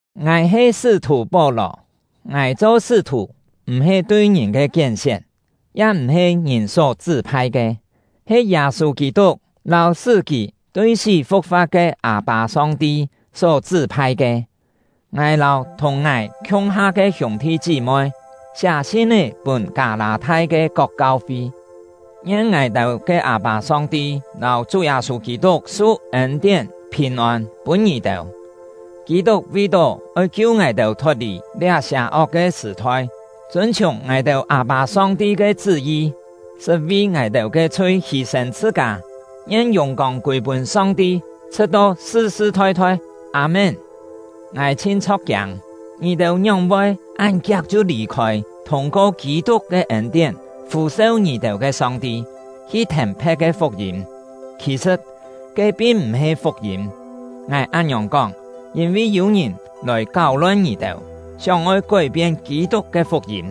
Ngài he sṳ́-thù Pó-lò. Ngài cho sṳ́-thù m̀-he tui ngìn ke kién-sién, ya m̀-he ngìn só chṳ́-phai ke, he Yâ-sû Kî-tuk lâu sṳ́ kì tui sí fu̍k-fa̍t ke Â-pâ Song-ti só chṳ́-phai ke. Ngài lâu thùng ngài khiung-ha ke hiûng-thi chí-moi siá sin-é pûn Kâ-lâ-thai ke kok kau-fi. Ngien ngài-têu ke Â-pâ Song-ti lâu Chú Yâ-sû Kî-tuk su ên-tién, phìn-ôn pûn ngì-têu! Kî-tuk vi-tó oi kiu ngài-têu thot-lì liá sià-ok ke sṳ̀-thoi, chûn-chhiùng ngài-têu Â-pâ Song-ti ke chṳ́-yi, sṳt vi ngài-têu ke chhui hî-sên chhṳ-kâ. Ngien yùng-kông kûi-pûn Song-ti, chhṳ̍t-to sṳ-sṳ thoi-thoi! Â-mén. Ngài chhin chho̍k-kiâng! Ngì-têu ngióng-voi án kiak chhiu lì-khôi thûng-ko Kî-tuk ke ên-tién fû-seu ngì-têu ke Song-ti, hi thèn phe̍t ke fuk-yîm! Khì-sṳ̍t, ke pin m̀-he fuk-yîm. Ngài án-ngiòng kóng, yîn-vi yû ngìn lòi káu-lon ngì-têu, sióng-oi kói-pien Kî-tuk ke fuk-yîm.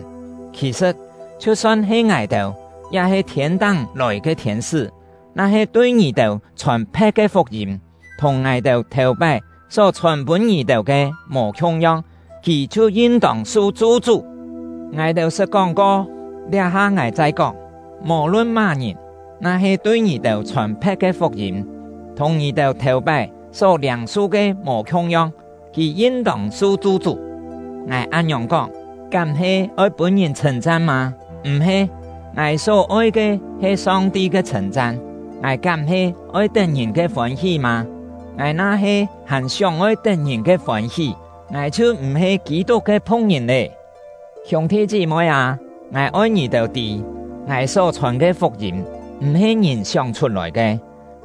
Khì-sṳ̍t, chhiu-son he ngài-têu, ya-he thiên-táng lòi ke thiên-sṳ́, na-he tui ngì-têu chhòn phe̍t ke fuk-yîm, thùng ngài-têu thèu-pái só-chhòn pûn ngì-têu ke mò khiung-yong, kì chhiu yin-tông su chu-chú! Ngài-têu sṳt kóng-ko, liá-ha ngài chai kóng: Mò-lun má-ngìn, na-he tui ngì-têu chhòn phe̍t ke fuk-yîm, thùng ngì-têu thèu-pái só liâng-su ke mò khiung-yong, kì yin-tông su chu-chú! Ngài án-ngiòng kóng, kám he oi pûn-ngìn chhṳ̂n-chan mâ? M̀-he! Ngài só-oi ke he Song-ti ke chhṳ̂n-chan! Ngài kám he oi tet ngìn ke fôn-hí mâ? Ngài na-he hàn sióng-oi tet ngìn ke fôn-hí, ngài chhiu m̀-he Kî-tuk ke phu̍k-ngìn lé. Hiûng-thi chí-moi â, ngài oi ngì-têu tî, ngài só chhòn ke fuk-yîm m̀-he ngìn sióng-chhut-lòi ke.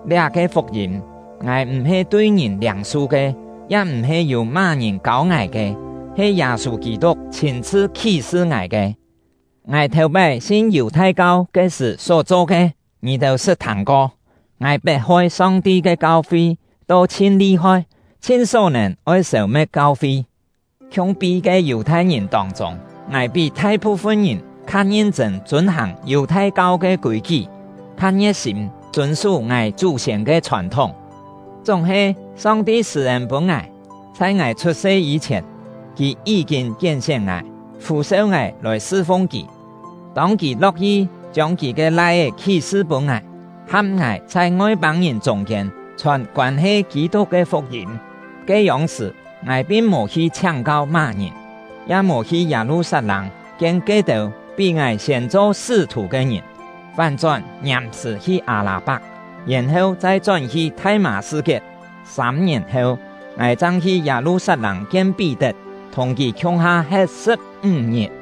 Liá-ke fuk-yîm, ngài m̀-he tui ngìn liâng-su ke, ya m̀-he yû má-ngìn kâu ngài ke, he Yâ-sû Kî-tuk chhîn-chhṳ khí-sṳ ngài ke. Ngài thèu-pái sin Yù-thai-kau ke sṳ̀ só cho ke, ngì-têu sṳt thâng-ko. Ngài pet-hoi Song-ti ke kau-fi to chhin li-hoi, chhin só-nèn oi sêu-me̍t kau-fi. Khiung-pi ke Yù-thai-ngìn tông-chûng, ngài pí thai-phu-fun ngìn kha ngin-chṳ̂n chûn-hàng Yù-thai-kau ke kûi-kí, kha ngie̍t-sîm chûn-sú ngài chú-siên ke chhòn-thúng. Chúng-he, Song-ti sṳ̂-ên pûn ngài, chhai ngài chhut-se yî-chhièn, Kì yí-kîn kién-sién ngài, fû-seu ngài lòi sṳ-fung Kì. Tông Kì lo̍k-yi chiông Kì ke Lai-é khí-sṳ pûn ngài, ham ngài chhai Ngoi-pâng-ngìn chûng-kiên chhòn koân-he Kî-tuk ke fuk-yîm, ke-yông-sṳ̀, ngài pin mò hi chhiáng-kau má-ngìn, ya mò hi Yâ-lu-sat-lâng kien ke-têu pí ngài siên cho sṳ́-thù ke ngìn, fán-chón ngiàm-sṳ̀ hi Â-lâ-pak, yèn-heu chai chón-hi Thai-mâ-sṳ-kiet. Sâm-ngièn heu, ngài chang hi Yâ-lu-sat-lâng kien Pí-tet, thùng kì khiung-ha he̍t sṳ̍p-ńg ngit.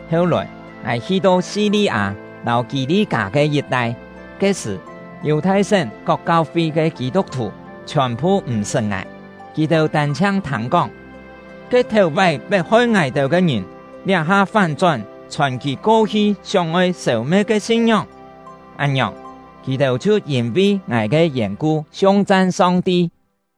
Heu-lòi, ngài hi-to Si-li-â lâu Kî-li-kâ ke yit-tai. Ke-sṳ̀, Yù-thai-sén kok kau-fi ke Kî-tuk-thù chhiòn-phu m̀-sṳt ngài. Kì-têu tân-chhiang thâng-kóng: “Ke thèu-pái pet-hoi ngài-têu ke ngìn, liá-ha fán-chón chhòn kì ko-hi sióng-oi sêu-me̍t ke sin-ngióng!” Án-ngiòng, kì-têu chhiu yîn-vi ngài ke yèn-ku siung-chan Song-ti!